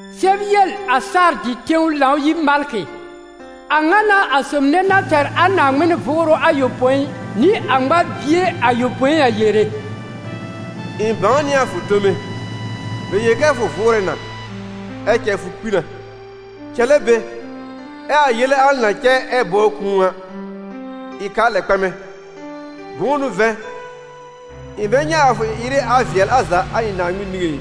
«Sɛb yel a Sardɩ tẽw Lãw-yir malkɩ: ‹A ŋa n'a a sob nɛ na tɛr a Naaŋmɩn Vʋʋrʋ ayopõi nɩ a ŋmar-bie ayopõi a yere: ɩ̃ bãw nɩ a fʋ tome; bɛ yel kɛ fʋ vʋʋrɛ na, ɛ cɛ fʋ kpi na. Cɛlɛ be, ɛ a yele al na cɛ ɛ bɔbr kũu a, ɩ k'a lɛ kpɛmɛ. Bʋ̃ʋ n'ʋ vɛ̃, ɩ̃ bɛ nyɛ̃ a fʋ ɩ-ɩrɩ a vɩɛl a za a ɩ̃ Naaŋmɩn niŋé ɩ.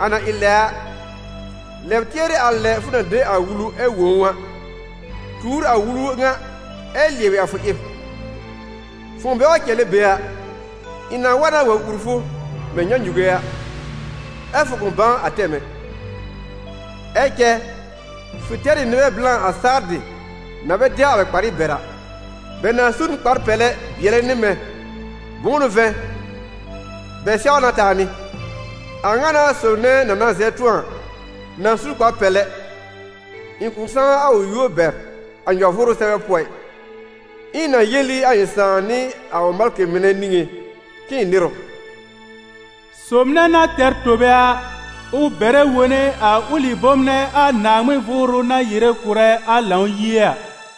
A na ɩ lɛ a, lɛb tɩɛrɩ a lɛ fʋ na de a wulu ɛ wõ ʋ a; tuur a wulu ŋa ɛ lɩɛbɩ a fʋ ɩb. Fʋ̃ʋ bɛ wa cɛlɛ be a, ɩ̃ na wa na wa ùr fʋ mɛ̃ nyãnyuge a, ɛ́ fʋ kʋ̃ bãw a tɛm ɛ. Ɛ cɛ fʋ tɛr ɩ nɩbɛ blã a Sardɩ, na bɛ dɛw a bɛ kparɩ bɛr a. Bɛ na su n kpar-pɛlɛ bɩɛlɛ nɩ mɛ̃, bʋ̃ʋ n'ʋ vɛ̃, bɛ sɛw na taa nɩ.›» «A ŋa n'a a sob nɛ na na zɛb tʋ̃ɔ a na su kpar-pɛlɛ; ɩ̃ kʋ̃ sãw a ʋ yúor bɛr a nyɔ-vʋʋrʋ sɛbɛ pʋɔ ɩ, ɛ ɩ̃ na yel ɩ a ɩ̃ Sãà nɩ a ʋ malkɩ mɩnɛ niŋé k'ɩ̃ɩ nɩr ʋ.» «Sob nɛ na tɛr tobe a, ʋ bɛrɛ wone a ʋlɩ bom nɛ a Naaŋmɩn Vʋʋrʋ na yere kʋ̀rɛ a Lãw-yie a.»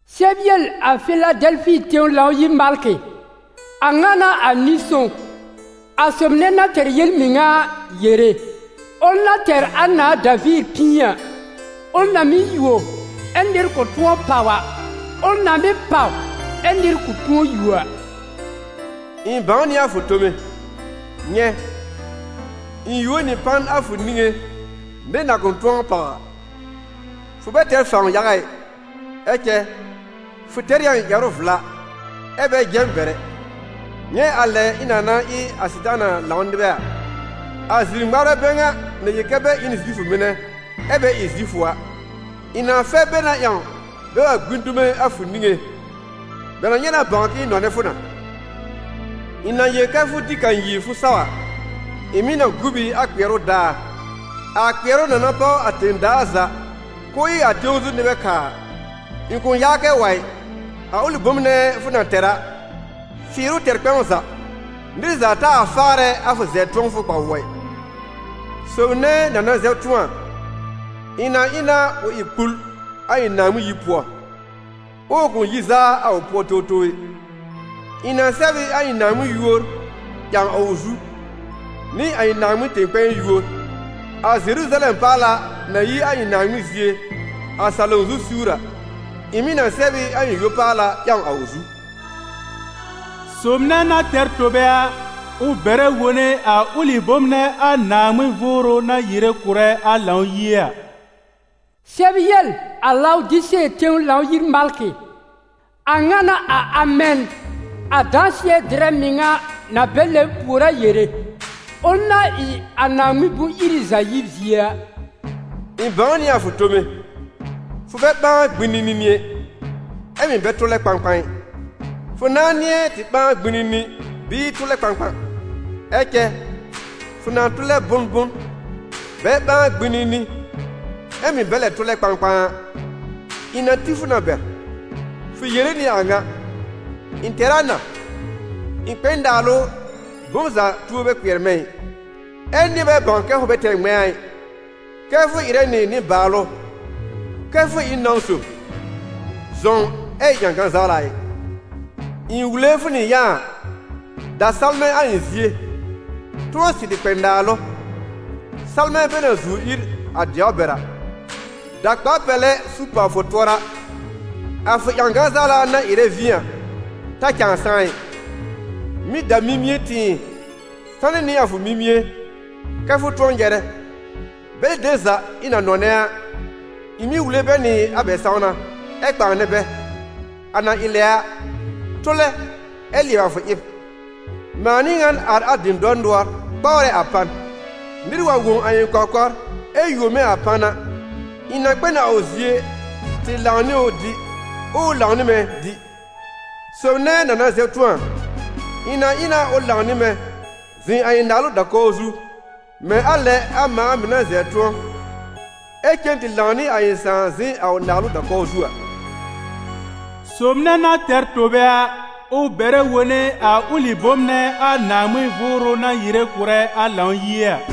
«Sɛb yel a Fɩladɛlfɩ tẽw Lãw-yir malkɩ: ‹A ŋa n'a a Nɩ-sõw, a Sob nɛ na tɛr yel-mɩŋa a, yere, ʋl na tɛr a nãà Daviir pĩi a, ʋl na mɩ́ yuo ɛ́ nɩr kʋ̃ tʋ̃ɔ pàw a, ʋl na mɩ́ pàw ɛ́ nɩr kʋ̃ tʋ̃ɔ yuo a: ɩ̃ bãw nɩ a fʋ tome. Nyɛ̃, ɩ̃ yuo nɩ pan a fʋ niŋé nɩr na kʋ̃ tʋ̃ɔ pàw a. Fʋ bɛ tɛr fãw yaga ɩ, ɛ cɛ fʋ tɛr ɩ a ɩ̃ ƴɛrʋ vla ɛ bɛ jɛ m bɛr ɛ. Nyɛ̃ a lɛ ɩ̃ na na ɩ a Sɩtaana lãw nɩbɛ a, a zir-ŋmarbɛ bɛ ŋa na yel kɛ bɛ ɩ n Zifʋ mɩnɛ ɛ bɛ ɩ Zifʋ a: ɩ̃ na fɛr bɛ na ƴãw bɛ wa gbĩ dume a fʋ niŋé. Bɛ na nyɛ̃ na bãw k'ɩ̃ɩ nɔnɛ fʋ na. Ɩ̃ na yel kɛ́ fʋ dɩ kanyir fʋ saw a, ɩ̃ mɩ̀ na gu b ɩ a kpɩɛrʋ daar, a kpɩɛrʋ na na páw a tẽ-daa za k'ʋʋ ɩ a tẽw zu nɩbɛ kaa a. Ɩ̃ kʋ̃ yaa kɛ wa ɩ. A ʋlɩ bom nɛ fʋ na tɛr a, fɩɩr ʋ tɛr kpɛ̃w za, nɩr za taa faarɛ a fʋ zɛb-tʋ̃ɔfʋ kpa-wʋɔ ɩ. Sob nɛ na na zɛb tʋ̃ɔ a, ɩ̃ na ɩ na ʋ ɩ kpul a ɩ̃ Naaŋmɩn yir pʋɔ, ɛ ʋ kʋ̃ yi zaa a ʋ pʋɔ towtow ɛ. Ɩ̃ na sɛb ɩ a ɩ̃ Naaŋmɩn yúor ƴãw a ʋ zu, nɩ a ɩ̃ Naaŋmɩn tẽ-kpɛ̃ɛ yúor, a Zeruzalɛm paala na yi a ɩ̃ Naaŋmɩn zie a salom zu siwr a. Ɩ̃ mɩ̀ na sɛb ɩ a ɩ̃ yo-paala ƴãw a ʋ zu. Sob nɛ na tɛr tobe a, ʋ bɛrɛ wone a ʋlɩ bom nɛ a Naaŋmɩn Vʋʋrʋ na yere kʋ̀rɛ a Lãw-yie a.›» «Sɛb yel a Lawdise tẽw Lãw-yir malkɩ: ‹A ŋa n'a a Amɛn, a dãsɩɛ-dɩrɛ mɩŋa na bɛ lɛbr pùor a yere, ʋl na ɩ a Naaŋmɩn bʋ̃-iri za yib zie a: ɩ̃ bãw nɩ a fʋ tome, fʋ bɛ ɓãa gbinini ɛ, ɛ mɩ̀ bɛ tʋlɛ kpãkpã ɩ. Fʋ nãá nɩ̃ɛ tɩ ɓãa gbinini bɩɩ tʋlɛ kpãkpã! Ɛ cɛ, fʋ na tʋlɛ bʋnbʋn, bɛ ɓãa gbĩnini ɛ mɩ̀ bɛ lɛ tʋlɛ kpãkpã a, ɩ̃ na ti fʋ na bɛr. Fʋ yere nɩ a ŋa: «Ɩ̃ tɛr a na, ɩ̃ kpɛ n naalʋ, bom za tuo bɛ kpɩɛr mɛ̃ ɩ.» Ɛ nɩ̃ɛ bɛ bãw kɛ fʋ bɛ tɛr ŋmɛ̃a ɩ, kɛ́ fʋ ɩrɛ nɩ nɩ-baalʋ, kɛ fʋ ɩ n nãw sob, zɔ̃w ɛ ɩ ƴãgan zawla ɩ! Ɩ̃ wule fʋ nɩ yã a: da salmɛ̃ a ɩ̃ zie, tʋ̃ɔ sɩrɩ kpɛ naalʋ, salmɛ̃ bɛ na zuw ír a dɛwr bɛr a; da kpar-pɛlɛ su pàw fʋ tʋɔra, a fʋ ƴãgan zawla na ɩrɛ vĩ a ta cãa sãá ɩ; mɩ̀ da mimie tɩ̃ɩ sanɩ nɩ a fʋ mimie kɛ́ fʋ tʋ̃ɔ nyɛrɛ. Bɛlɩ dem za ɩ̃ na nɔnɛ a, ɩ̃ mɩ́ wule bɛ nɩ a bɛ sãwna ɛ kpãanɛ bɛ. A na ɩ lɛ a, tʋlɛ ɛ lɩɛbɩ a fʋ ɩb. Mãa n'ɩ ŋan ar a dɩ̃dɔr nʋɔr kpawrɛ a pan. Nɩr wa wõ a ɩ̃ kɔkɔr ɛ yuo mɛ̃ a pan a, ɩ̃ na kpɛ n a ʋ zie tɩ lãw nɩ ʋ dɩ, ɛ ʋ lãw nɩ mɛ̃ dɩ.›» «Sob nɛ na na zɛb tʋ̃ɔ a, ɩ̃ na ɩ na ʋ lãw nɩ mɛ̃ zɩ̃ a ɩ̃ naalʋ da-kɔw zu, mɛ̃ a lɛ a mãa mɩ̀ na zɛb tʋ̃ɔ, ɛ cen tɩ lãw nɩ a ɩ̃ Sãà zɩ̃ a ʋ naalʋ da-kɔw zu a.» «Sob nɛ na tɛr tobe a, ʋ bɛrɛ wone a ʋlɩ bom nɛ a Naaŋmɩn Vʋʋrʋ na yere kʋ̀rɛ a Lãw-yie a.»